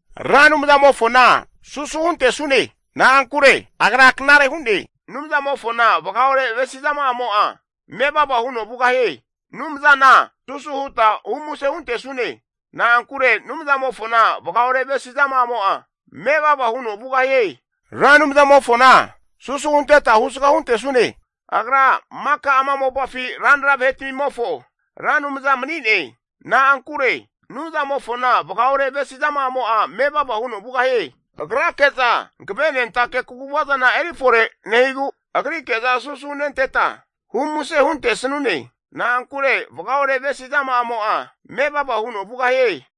Ra Anumzamofona susu huntesune, na'ankure Agra knare hu'ne. Anumzamofona vagaore avesizama'amo'a mevava huno vugahie. Anumzana susu huta humuse huntesune. Na'ankure Anumzamofona vagaore avesizama'amo'a mevava huno vugahie. Ra Anumzamofona susu hunteta husga huntesune, Agra maka ama mopafi ranra vahetmimofo Ra Anumza mani'ne. Na'ankure Anumzamofona vagaore avesizama'amo'a mevava huno vugahie. Agrake'za hankavenentake kaguvazana eri fore nehigu, Agrike'za susu hunenteta humuse huntesanune. Na'ankure vagaore avesizama'amo'a mevava huno vugahie.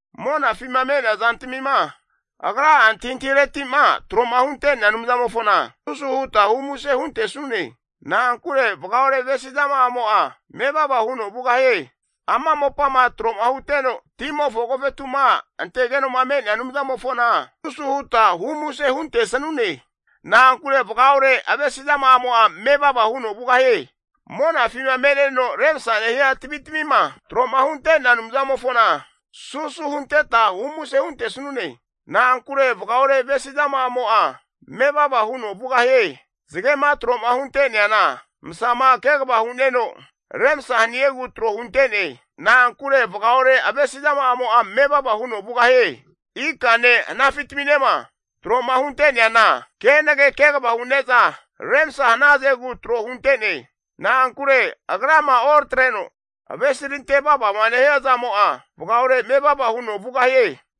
Monafima me'nea zantamima Agra'a antahintahireti'ma tro'ma hunte'nea Anumzamofona susu huta humuse huntesanune. Na'ankure vagaore avesizama'amo'a mevava huno vugahie. Ama mopama tro huteno, timofo agofetu'ma antegeno'ma me'nea Anumzamofona susu huta humuse huntesanune. Na'ankure vagaore avesizama'amo'a mevava huno vugahie. Monafima me'neno remsa nehia tavitamima tro'ma hunte'nea Anumzamofona susu hunteta humuse huntesanune. Na'ankure vagaore avesizama'amo'a mevava huno vugahie. Zagema tro'ma hunte'neana, masama kegavama hu'neno remsa haniegu tro hunte'ne. Na'ankure vagaore avesizama'amo'a mevava huno vugahie. Ikane hanafi'taminema tro'ma hunte'neana, kenage kegava hune'za, remsa hanazegu tro hunte'ne. Na'ankure Agrama oratreno avesirante vavama nehia zamo'a, vagaore mevava huno vugahie.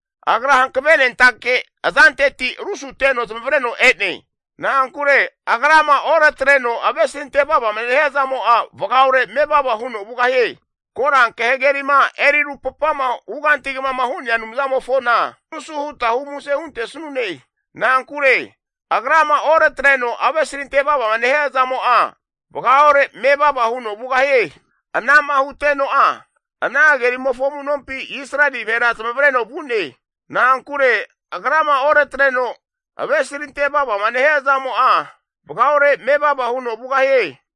Agra Hankavenentake azanteti rusuteno zamavareno e'ne. Na'ankure Agrama oratareno avesirante vavama nehia zamo'a, vagaore mevava huno vugahie. Koranke hagerima eri rupapama hugantigama hu'nea Anumzamofona susu huta humuse huntesanune. Na'ankure Agrama oratreno avesirante vavama nehia zamo'a, vagaore mevava huno vugahie. Ana'ma huteno'a ana hagerimofo amu'nompi Israeli vahera zamavareno vu'ne. Na'ankure Agrama oratreno avesirante vavama nehia zamo'a, vagaore mevava huno vugahie.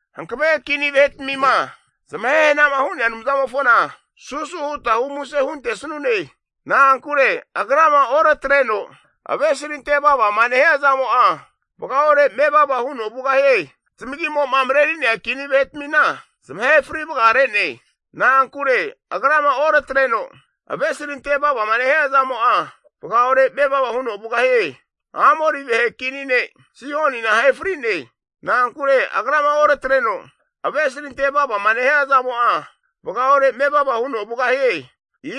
Hankave kini vahetmima zamahe hana'ma hu'nea Anumzamofona susu huta humuse huntesanune. Na'ankure Agrama oratareno avesirante vavama nehia zamo'a, vagaore mevava huno vugahie. Zamagimo'ma mareri'nea kini vahetamina zamahe fri vagare'ne. Na'ankure Agrama oratareno avesirante vavama nehia zamo'a, vagaore mevava huno vugahie. Amori vahe kini ne' Sihonina ahe fri'ne. Na'ankure Agrama oratareno avesirante vavama nehia zamo'a, vagaore mevava huno vugahie.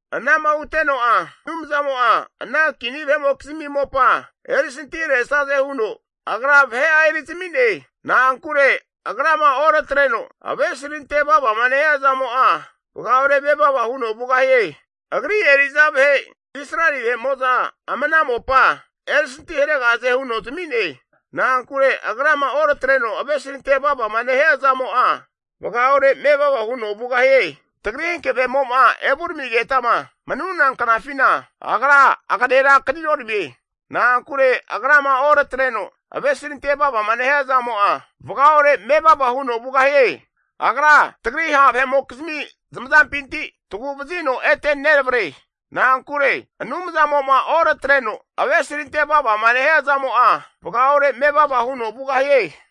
Ana'ma huteno'a Anumzamo'a ana kini vahe'mokizmi mopa, erisantiharesaze huno Agra vahe'a erizami'ne. Na'ankure Agrama oratareno avesirante vavama nehia zamo'a, vagaore mevava huno vugahie. Agri eri'za vahe Israeli vahe'mo'za ama ana mopa erisanti haregahaze huno zami'ne. Na'ankure Agrama oratreno avesirante vavama nehia zamo'a, vagaore mevava huno vugahie. Tagri hankavemo'ma evuramigetama manuna knafina Agra aganera kaninoramie. Na'ankure Agrama oratreno avesirante vavama nehia zamo'a, vagaore mevava huno vugahie. Agra tagri ha' vahe'mokizmi zamazampinti tagu'vazino ete neravare. Na'ankure Anumzamo'ma oratareno avesirante vavama nehia zamo'a, vagaore mevava huno vugahie.